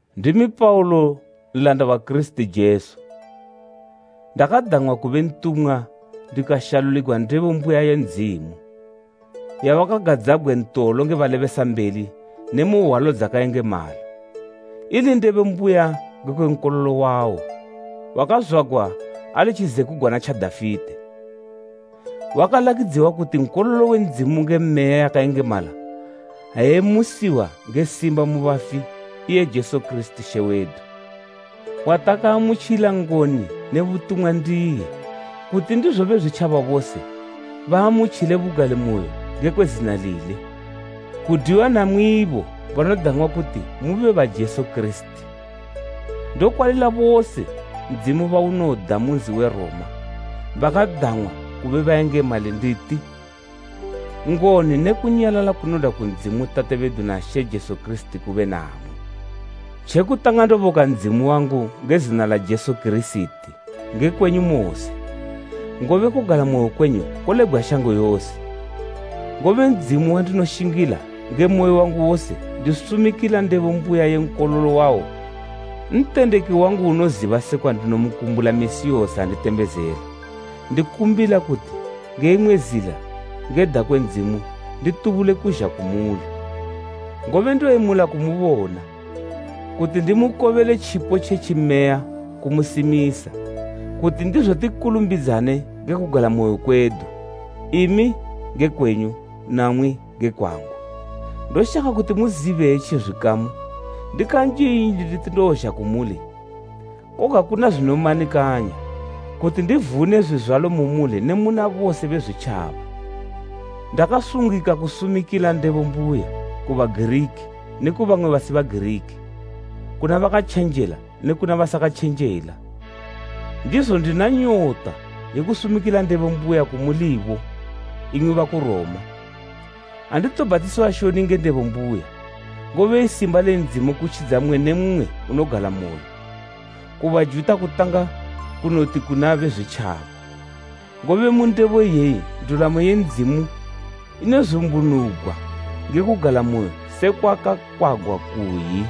Ndimi Paulo, nlanda wa Kirisiti Jesu ndakadang'wa kube ntumwa ndikashaluligwa ndebo mbuya ye Ndzimu, yawakagadzabgwe ntolo nge balebesambeli ne mu hwalo dzakayengemala, ili ndebo mbuya ngekwe Nkololo wawo, wakazwagwa ali tjizekugwana tja Dafite. Wakalakidziwa kuti nkololo we Ndzimu nge Meya yakayengemala ha emusiwa nge simba mu bafi, iye Jesu Kirisiti She wedu, watakaamutjila ngoni ne butumwa ndiye, kuti ndizo Bezwitjaba bose baamutjile bugalimoyo ngekwe zina lile, kudwiwa namwibo banodang'wa kuti mube ba Jesu Kirisiti. Ndokwalila bose Ndzimu bawunoda mu nzi we Roma bakadang'wa kube bayengemali nditi: Ngoni ne kunyalala kunodwa ku Ndzimu Tate bedu na She Jesu Kirisiti kube namwi. Tjekutanga ndoboka Ndzimu wangu nge zina la Jesu Kirisiti nge kwenyu mose, ngobe kugalamoyo kwenyu kolebgwa shango yose. Ngobe Ndzimu wandinoshingila nge moyo wangu wose ndisumikila ndebo mbuya ye Nkololo wawo, ntendeki wangu unoziba sekwa ndinomukumbula misi yose ha nditembezela, ndikumbila kuti nge imwe zila ngeda kwe Ndzimu nditubule kuzha kumuli. Ngobe ndoyemula kumubona, kuti ndimukobele tjipo tje tjimeya kumusimisa, kuti ndizo tikulumbidzane nge kugalamoyo kwedu, imi nge kwenyu, namwi nge kwangu. Ndoshaka kuti muzibe etji zwikamu, ndikanjinji nditi ndozha kumuli koga kuna zwinomanikanya kuti ndivune zwizwalo, mu muli ne muna bose Bezwitjaba. Ndakasungika kusumikila ndebo mbuya, ku Bagiriki ne kubamwe basi Bagiriki, kuna bakatjenjela ne kuna basakatjenjela. Ndizo, ndina nyota ye kusumikila ndebo mbuya kumulibo imwi baku Roma. Anditobhatisiwa shoni nge ndebo mbuya, ngobe i simba le Ndzimu kutjidza mmwe ne mmwe unogalamoyo, ku Bajuta kutanga kunoti ne kuna Bezwitjaba. Ngobe mu ndebo iyeyi ndulamo ye Ndzimu inozumbunugwa nge kugalamoyo, sekwa kwakakwagwa kuyi,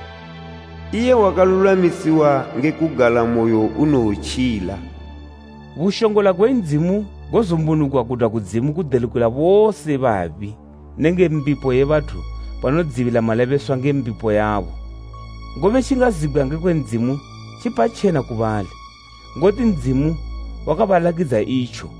“Iye wakalulwamisiwa nge kugalamoyo unowotjila.” Bushongola gwe Ndzimu gozumbunugwa gudwa kudzimu gudelukila bose babi nenge mbipo ye bathu banodzibila malebeswa nge mbipo yabo. Ngobe tjingazibgwa ngekwe Ndzimu tjipatjena ku bali, ngoti Ndzimu wakabalakidza itjo.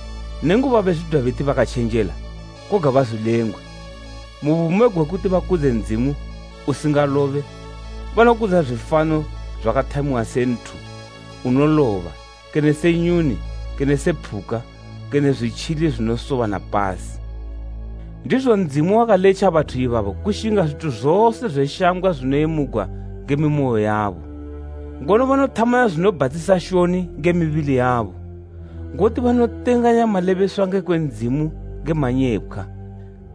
Nenguba bezwidwa beti bakatjenjela, koga bazwilengwe, mu bumo gwekuti bakudze Ndzimu usingalobe, banokudza zwifano zwakathamiwa se nthu unoloba kene se nyuni kene se phuka kene zwitjili zwinosoba na pasi. Ndizo Ndzimu wakaletja bathu ibabo kushinga zwithu zose zwe shambgwa zwinoyemugwa nge mimoyo yabo, ngono banothamana zwinobhatisa shoni nge mibili yabo. Ngoti banotenganya malebeswa ngekwe Ndzimu nge manyepkhwa,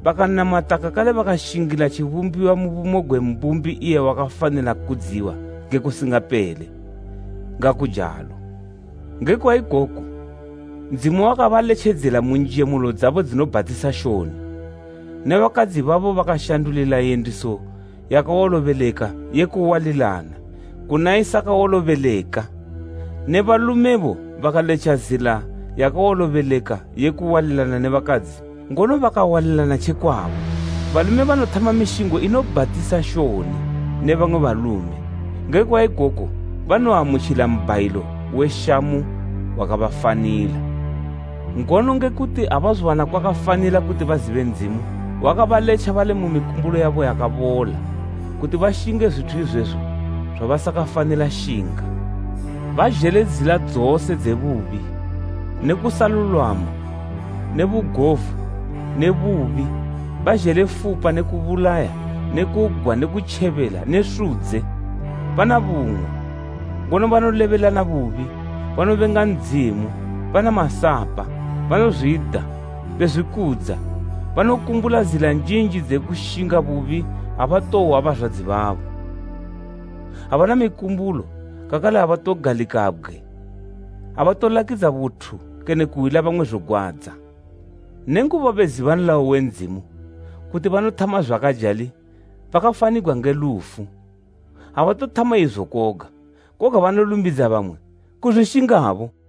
bakanamata kakale bakashingila tjibumbiwa mu bumo gwe Mbumbi iye wakafanila kudziwa nge kusingapele! Ngakujalo. Ngekwa ikoku, Ndzimu wakabaletjedzela mu njemulo dzabo dzinobhatisa shoni. Ne bakadzi babo bakashandulila yendiso yakawolobeleka ye kuwalilana kuna isakawolobeleka. Ne balumebo bakaletja zila yakawolobeleka yekuwalilana ne bakadzi ngono bakawalilana tjekwabo. Balume banothama mishingo inobhatisa shoni ne bamwe balume. Ngekwa ikoku banoamutjila mbhayilo we shamu wakabafanila. Ngono ngekuti abazowana kwakafanila kuti bazibe Ndzimu, wakabaletja bali mu mikumbulo yabo yakabola, kuti bashinge zwithu izwezo zwabasakafanila shinga. Bazhele zila dzose dze bubi, ne kusalulwama ne bugovu ne bubi, bazhele fupa ne kubulaya ne kugwa ne kutjebela ne sudze. Bana bung'wa, ngono banolebelana bubi, banobenga Ndzimu, bana masapa, banozwida, bezwikudza, banokumbula zila njinji dze kushinga bubi abatohwa bazwadzi babo. Abana mikumbulo kakale abatogalikabgwe, abatolakidza buthu kene kuhwila bamwe zogwadza. Nenguba beziba nlayo we Ndzimu, kuti banothama zwakajali bakafanigwa nge lufu, abatothama izo koga, koga banolumbidza bamwe kuzwishingabo.